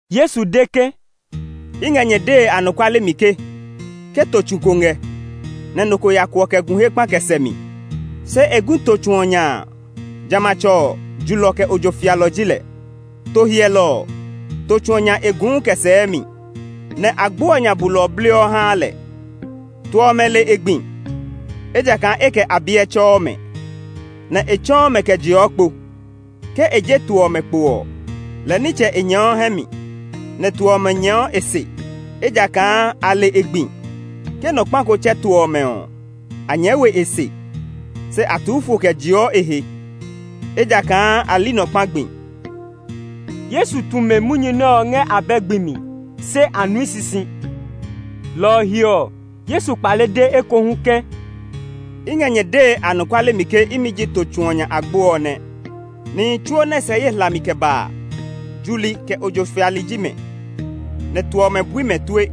Yesu de ke, “I ngɛ nyɛ dee anɔkuale mi ke, ke to tsu ngɛ, nɛ nɔ ko ya kuɔ kɛ gu he kpa kɛ sɛ mi, se e gui to tsu ɔ nya a, jamɛatsɛ ɔ, julɔ kɛ ojo fialɔ ji lɛ. To hyɛlɔ ɔ, to tsu ɔ nya e guu kɛ sɛɛ mi; nɛ agbo ɔ nya bulɔ ɔ bliɔ haa lɛ. To ɔmɛ le e gbi, ejakaa e kɛ a biɛ tsɛɔ mɛ, nɛ e tsɔ́ɔ́ mɛ kɛ jeɔ kpo. Ke e je to ɔmɛ kpo ɔ, lɛ nitsɛ e nyɛɛɔ hɛ mi, nɛ to ɔmɛ nyɛɛɔ e se, ejakaa a le e gbi. Ke nɔ kpa ko tsɛ to ɔmɛ ɔ, a nyɛɛ we e se, se a tuu fo kɛ jeɔ e he, ejakaa a li nɔ kpa gbi.” Yesu tu mɛ munyu nɛ ɔ ngɛ abɛ gbi mi, se a nui sisi. Lɔ ɔ he ɔ, Yesu kpale de ekohu ke, “I ngɛ nyɛ dee anɔkuale mi ke imi ji to tsu ɔ nya agbo ɔ nɛ. Nihi tsuo nɛ sɛ ye hlami kɛ ba a, juli, kɛ ojo fiali ji mɛ; nɛ to ɔmɛ bui mɛ tue.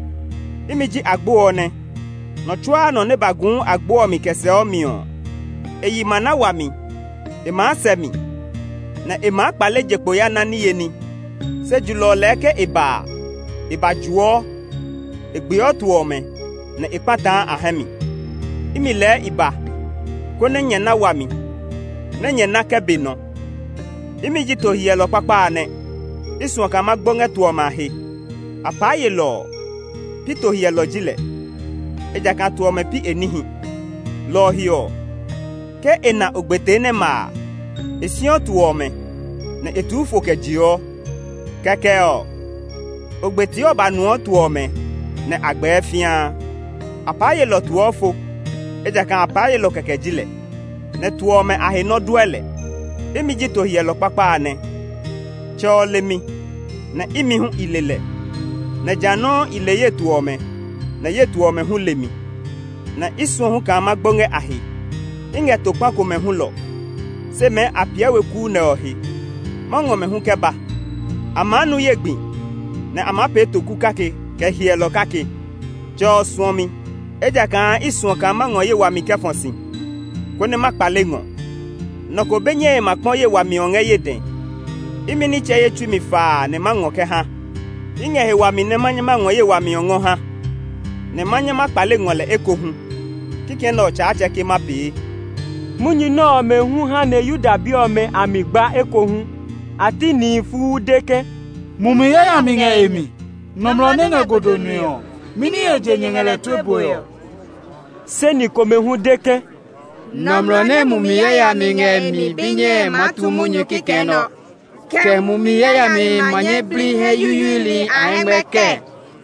Imi ji agbo ɔ nɛ; nɔ tsuaa nɔ nɛ ba guu agbo ɔ mi kɛ sɛɔ mi ɔ, e yi ma na wami. E maa sɛ mi, nɛ e maa kpale je kpo ya na niye ní. Se julɔ ɔ lɛɛ ke e ba a, e ba juɔ; e gbeɔ to ɔmɛ, nɛ e kpataa a hɛ mi. Imi lɛɛ i ba, konɛ nyɛ na wami, nɛ nyɛ na kɛ be nɔ. “Imi ji to hyɛlɔ kpakpa a nɛ. I suɔ kaa ma gbo ngɛ to ɔmɛ a he. Apaa yelɔ ɔ, pi to hyɛlɔ ji lɛ, ejakaa to ɔmɛ pi e níhi. Lɔ ɔ he ɔ, ke e na ogbetee nɛ ma a, e siɔ to ɔmɛ, nɛ e tuu fo kɛ jeɔ. Kɛkɛ ɔ, ogbetee ɔ ba nuɔ to ɔmɛ, nɛ a gbɛɛ fĩaa. Apaa yelɔ ɔ tuɔ fo, ejakaa apaa yelɔ kɛkɛ ji lɛ, nɛ to ɔmɛ a he nɔ dɔɛ lɛ. Imi ji to hyɛlɔ kpakpa a nɛ. Tsɛ ɔ le mi, nɛ imi hu i le lɛ; nɛ jã nɔuu i le ye to ɔmɛ, nɛ ye to ɔmɛ hu le mi. Nɛ i suɔ hu kaa ma gbo ngɛ a he. I ngɛ to kpa komɛ hulɔ, se mɛɛ a piɛ we kuu nɛ ɔ he. Ma ngɔ mɛ hu kɛ ba; a maa nu ye gbi, nɛ a maa pee to kuu kake, kɛ hyɛlɔ kake. “Tsɛ ɔ suɔ mi, ejakaa i suɔ kaa ma ngɔ ye wami kɛ fɔ si, konɛ ma kpale ngɔ. Nɔ ko be nyɛe ma kpɔ ye wami ɔ ngɛ ye dɛ. Imi nitsɛ ye tsui mi faa nɛ ma ngɔ kɛ ha. I ngɛ he wami nɛ ma nyɛ ma ngɔ ye wami ɔ ngɔ ha, nɛ ma nyɛ ma kpale ngɔ lɛ ekohu. Kikɛ nɛ ɔ Tsaatsɛ ke ma pee.” Munyu nɛ ɔmɛ hu ha nɛ Yuda bi ɔmɛ a mi gba ekohu. A ti nihi fuu de ke, “Mumi yayami ngɛ e mi. Nɔmlɔ nɛ ngɛ godo nue ɔ, mɛni he je nyɛ ngɛ lɛ tue bue ɔ?” Se ni komɛ hu de ke, “Nɔmlɔ nɛ mumi yayami ngɛ e mi be nyɛe maa tu munyu kikɛ nɛ ɔ. Kɛ mumi yayami ma nyɛ bli hɛ yuyuili a hɛngmɛ kɛɛ?”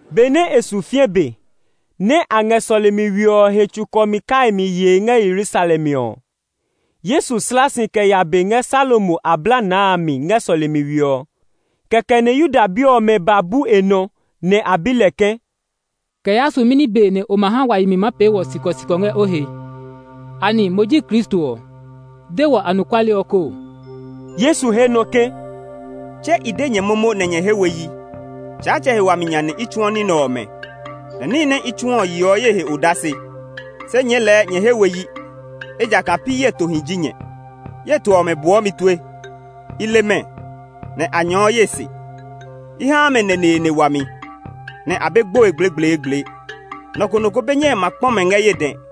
Be nɛ e su fĩɛ be, nɛ a ngɛ sɔlemi we ɔ he tsukɔmi kaimi yee ngɛ Yerusalem ɔ, Yesu slaa si kɛ ya be ngɛ Salomo ablanaa a mi ngɛ sɔlemi we ɔ. Kɛkɛ nɛ Yuda bi ɔmɛ ba bu e nɔ, nɛ a bi lɛ ke, “Kɛ yaa su mɛni be nɛ o ma ha wa yi mi maa pee wɔ sikɔsikɔ ngɛ o he? Anɛ mo ji Kristo ɔ? De wɔ anɔkuale ɔ koo!” Yesu he nɔ ke, “Tse i de nyɛ momo nɛ nyɛ he we yi! Tsaatsɛ he wami nya nɛ i tsuɔ ní nɛ ɔmɛ, nɛ níhi nɛ i tsuɔ ɔ yeɔ ye he odase. Se nyɛɛ lɛɛ nyɛ he we yi, ejakaa pi ye tohi ji nyɛ. Ye to ɔmɛ buɔ mi tue; i le mɛ, nɛ a nyɛɛɔ ye se. I haa mɛ neneene wami, nɛ a be gboe gblegbleegble. Nɔ ko nɔ ko be nyɛe ma kpɔ mɛ ngɛ ye dɛ.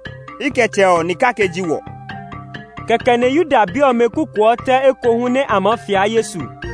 I kɛ Tsɛ ɔ ni kake ji wɔ.” Kɛkɛ nɛ Yuda bi ɔmɛ kukuɔ tɛ ekohu nɛ a maa fia Yesu.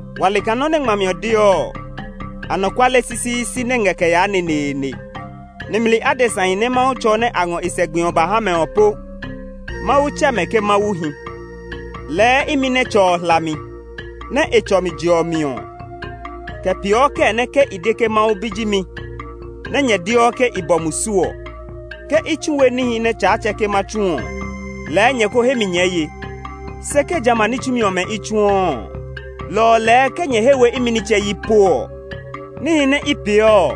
Wa le kaa nɔ nɛ ngmami ɔ deɔ ɔ, anɔkuale sisiisi nɛ́ ngɛ kɛ yaa neneene. Nimli adesahi nɛ Mawu tsɔ nɛ a ngɔ e sɛ gbi ɔ ba ha mɛ ɔ po Mawu tsɛ mɛ ke mawuhi. Lɛɛ imi nɛ Tsɛ ɔ hla mi, nɛ e tsɔ mi je ɔ mi ɔ, kɛ peeɔ kɛɛ nɛ ke i de ke Mawu Bi ji mi nɛ́ nyɛ deɔ ke i bɔ musu ɔ? Ke i tsu we níhi nɛ Tsaatsɛ ke ma tsu ɔ, lɛɛ nyɛ ko he mi nyɛɛ ye. Se ke jamɛ a ní tsumi ɔmɛ i tsuɔ ɔ, lɔ ɔ lɛɛ ke nyɛ he we imi nitsɛ yi po ɔ, níhi nɛ i peeɔ ɔ,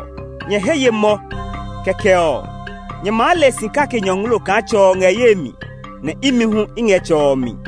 nyɛ he nyɛɛ ye mɔ. Kɛkɛ ɔ, nyɛ maa le si kake nyɔngloo kaa Tsɛ ɔ ngɛ ye mi, nɛ imi hu i ngɛ Tsɛ ɔ mi.”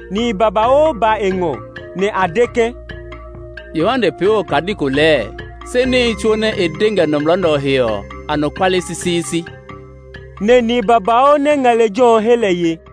Nihi babauu ba e ngɔ, nɛ a de ke, “Yohane pee we okadi ko lɛɛ, se níhi tsuo nɛ e de ngɛ nɔmlɔ nɛ ɔ he ɔ, anɔkuale sisiisi.” Nɛ nihi babauu nɛ ngɛ lejɛ ɔ he lɛ ye.